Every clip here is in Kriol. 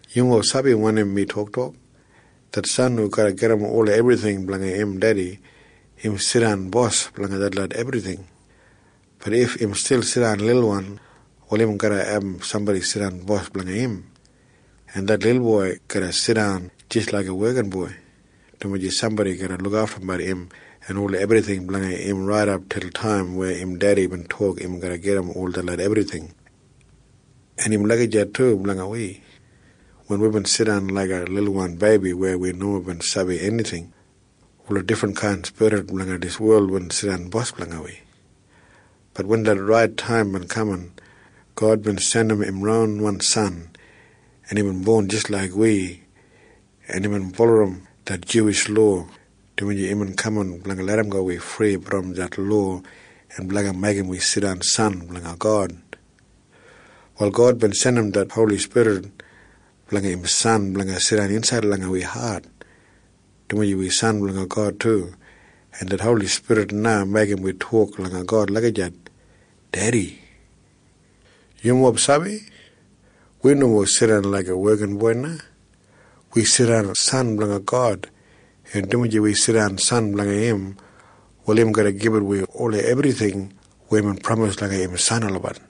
Yumob sabi wanim mi toktok? Det san hu garra gedim ola ebrijing blanga im dedi, im jidan bos blanga detlot ebrijing. Bat if im stil jidan lilwan, wal im garra abum sambodi jidan bos blanga im, en det lilboi garra jidan jis laiga wekinboi, dumaji sambodi garra lukaftumbat im en ola ebrijing blanga im raidap det taim weya im dedi bin tok im garra gedim ol detlot ebrijing. En im lagijat du blanga wi. Wen wibin jidan laiga lilwan beibi weya wi nomo bin sabi enijing, ola difrinkain spirit blanga dijan wel bin jidan bos langa wi. Bat wen det rait taim bin kaman, God bin jandim im ronwan San, en imbin bon jis laik wi, en imbin bulurrum det Juwish lowa, dumaji imbin kaman blanga larramgo wi fri brom det lowa en blanga meigim wi jidan biginini blanga God. Wal God bin jandim det Holi Spirit blanga im San blanga jidan insaid langa wi hat, dumaji wi biginini blanga God du, en det Holi Spirit na meigim wi gulum God, “Dedi.” Yumob sabi? Wi nomo jidan laiga wekinboi o wekingel na. Wi jidan biginini blanga God, en dumaji wi jidan biginini blanga im, wal im garra gibit wi ola ebrijing weya imbin pramis langa im biginini olabat.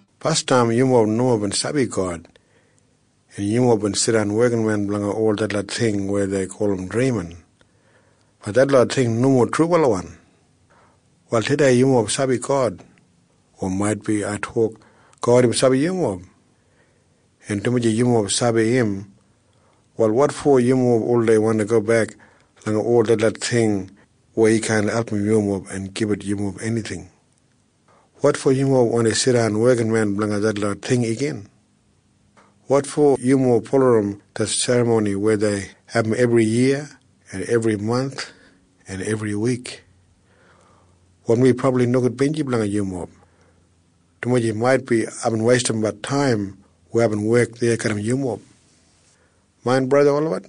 Basdam yumob nomo bin sabi God, en yumob bin jidan wekinmen blanga ol detlot ting weya dei gulum drimin. Bat detlot ting nomo trubalawan. Wal tudei yumob sabi God. O maitbi ai tok, God im sabi yumob. En dumaji yumob sabi im, wal wotfo yumob oldei wandi gobek langa ol detlot ting weya kaan album yumob en gibit yumob enijing? Wotfo yumob wandi jidan wekinmen blanga detlot ting weya dei gulum drimin igin? Wotfo yumob bulurrum detlot serramoni weya dei abum ebriyiya en ebrimanth en ebriwik? Wal mi brabli nogudbinji blanga yumob, dumaji maitbi aibin weistimbat taim weya aibin wek deya garram yumob. Main braja en sista olabat,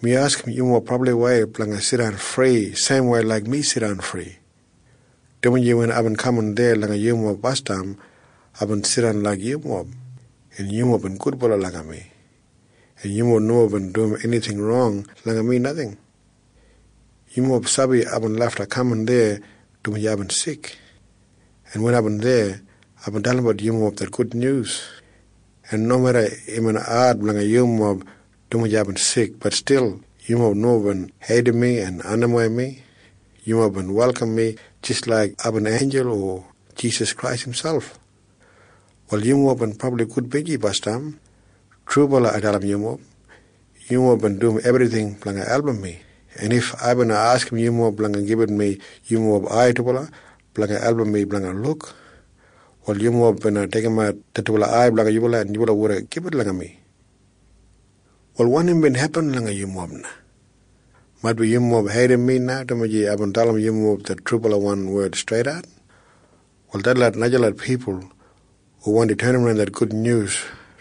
mi askim yumob brabliwei blanga jidan fri seimwei laik mi jidan fri, dumaji wen aibin kaman deya langa yumob basdam, aibin jidan laik yumob, en yumob bin gudbala langa mi, en yumob nomo bin dum enijing rong langa mi. Yumob sabi aibin lafta kaman deya dumaji aibin sik, en wen aibin deya, aibin dalimbat yumob det gudnyus, en nomeda imbin ad blanga yumob dumaji aibin sik, bat stil yumob nomo bin heidim mi en andimwei mi. Yumob bin welkam mi jis laik aibin einjul o Jisas Krais imselp. Wal yumob bin brabli gudbinji basdam. Trubala ai dalim yumob. Yumob bin dum ebrijing blanga album mi, en if ai bina askim yumob blanga gibit mi yumob ai dubala, blanga album mi blanga luk, wal yumob bina deigimat dubala en gibit langa mi. Wal wanim bin hepin langa yumob na? Maitbi yumob heidim mi na dumaji aibin dalim yumob det trubalawan wed streidat. Wal detlot najalot pipul hu wandi tenimran det gudnyus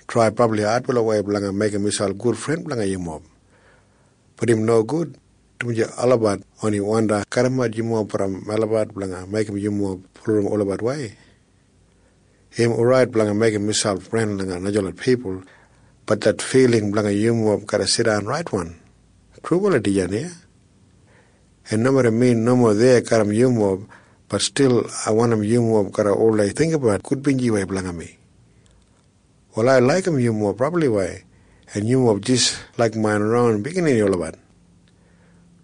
trai brabli adbalawei blanga meigim miselp gudfren blanga yumob. Bat im nogud, dumaji olabat oni wandi kadimat yumob brom melabat blanga meigim yumob bulurrum olabatwei. Im orait blanga meigim miselp fren langa najalot pipul. Bat det filing blanga yumob garra jidan raitwan. Trubala dijan iya. En nomeda mi nomo deya garram yumob, bat stil ai wandim yumob garra oldei jinggabat gudbinjiwei blanga mi. Wal ai laigim yumob brabliwei, en yumob jis laik main ron biginini olabat,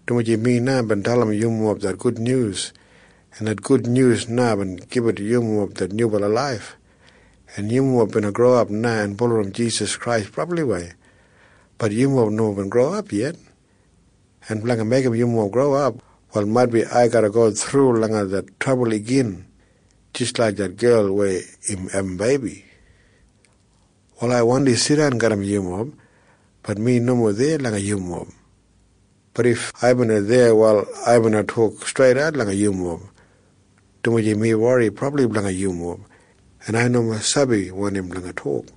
dumaji mi na bin dalim yumob det gudnyus, en det gudnyus na bin gibit yumob det nyubala laif, en yumob bina growap na en bulurrum Jisas Krais brabliwei. Bat yumob nomo bin growap yet. En blanga meigim yumob growap, wal maitbi ai garra go thru langa det trabul igin jis laik det gel weya im abum beibi. Wal ai wandi jidan garram yumob. Bat mi nomo deya langa yumob. Bat if ai bina deya, wal ai bina tok streidat langa yumob, dumaji mi wori brabli blanga yumob, en ai nomo sabi wanim blanga tok.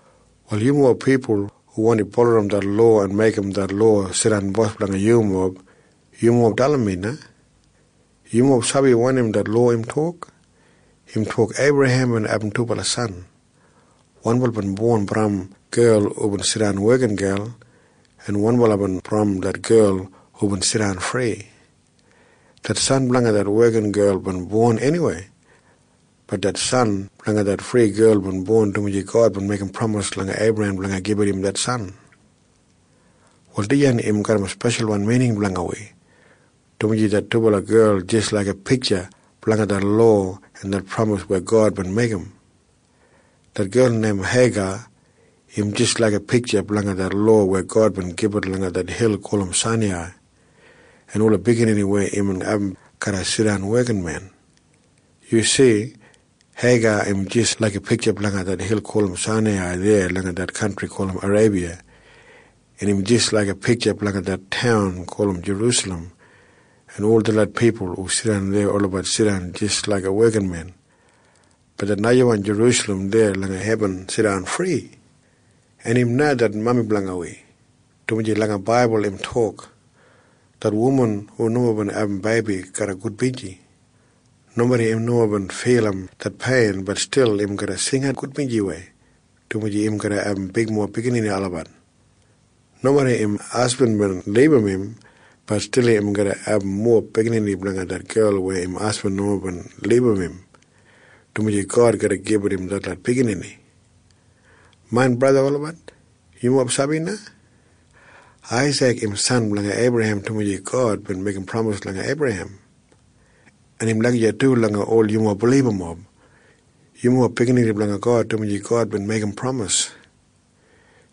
Wal yumob pipul hu wandi bulurrum det lowa en meigim det lowa jidan bos blanga yumob, yumob dalim mi na. Yumob sabi wanim det lowa im tok? Im tok Eibrahem bin abum dubala san. Wanbala bin brom det gel hubin jidan wekingel, en wanbala bin brom det gel hubin jidan friwan. Det san blanga det wekingel bin bon eniwei. Bat det san blanga det friwan gel bin bon dumaji God bin meigim pramis langa Eibrahem blanga gibit im det san. Wal dijan im garram speshalwan mining blanga wi, dumaji det dubala gel jis laiga pitja blanga det lowa en det pramis weya God bin meigim. Det gel neim Heiga im jis laiga pitja blanga det lowa weya God bin gibit langa det hil gulum Sainai, en ola biginini weya imbin abum garra jidan wekinmen. Yu si? Heiga im jis laiga pitja blanga det hil gulum Sainai deya langa det kantri gulum Areibiya, en im jis laiga pitja blanga Jerusalem, en ol detlot pipul hu jidan deya, olabat jidan jis laiga wekinmen. Bat det najawan Jerusalem deya langa hebin jidan friwan, en im na det mami blanga wi, dumaji langa oltestaman im tok, “Det wuman hu nomo bin abum beibi garra gudbinji. Nomeda im nomo bin filim det pein, bat stil im garra jingat gudbinjiwei, dumaji im garra abum bigmob biginini olabat. Nomeda im hasbin bin libum im, bat stil im garra abum mowa biginini langa det gel weya im hasbin nomo bin libum im, dumaji God garra gibit im detlot biginini.” Main braja en sista olabat, yumob sabi na? Aisik im san blanga Eibrahem dumaji God bin meigim pramis langa Eibrahem. En im lagijat du langa ol yumob bilibamob. Yumob biginini blanga God dumaji God bin meigim pramis.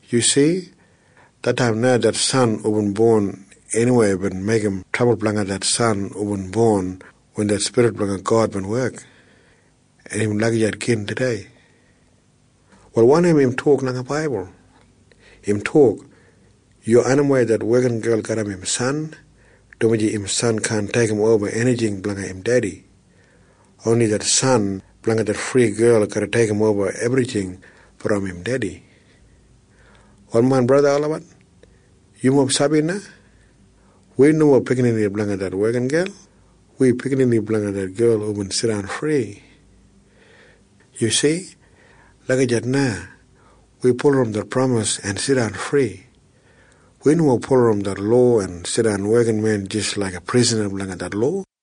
Yu si? Det taim na det san hubin bon eniwei bin meigim trabul blanga det san hubin bon wen det Spirit blanga God bin wek. En im lagijat gin tudei. Wal wanim im tok langa oltestaman? Im tok, “Yu andimwei det wekingel garram im san, dumaji im san kaan deigimoba enijing blanga im dedi. Oni det san blanga det friwan gel garra deigimoba ebrijing brom im dedi.” Wal main braja en sista olabat, yumob sabi na? Wi nomo biginini blanga det wekingel. Wi biginini blanga det gel hubin jidan fri. Yu si? Lagijat na. Wi bulurrum det pramis en jidan fri. Wi nomo bulurrum det lowa en jidan wekinmen jis laiga prisana blanga det lowa.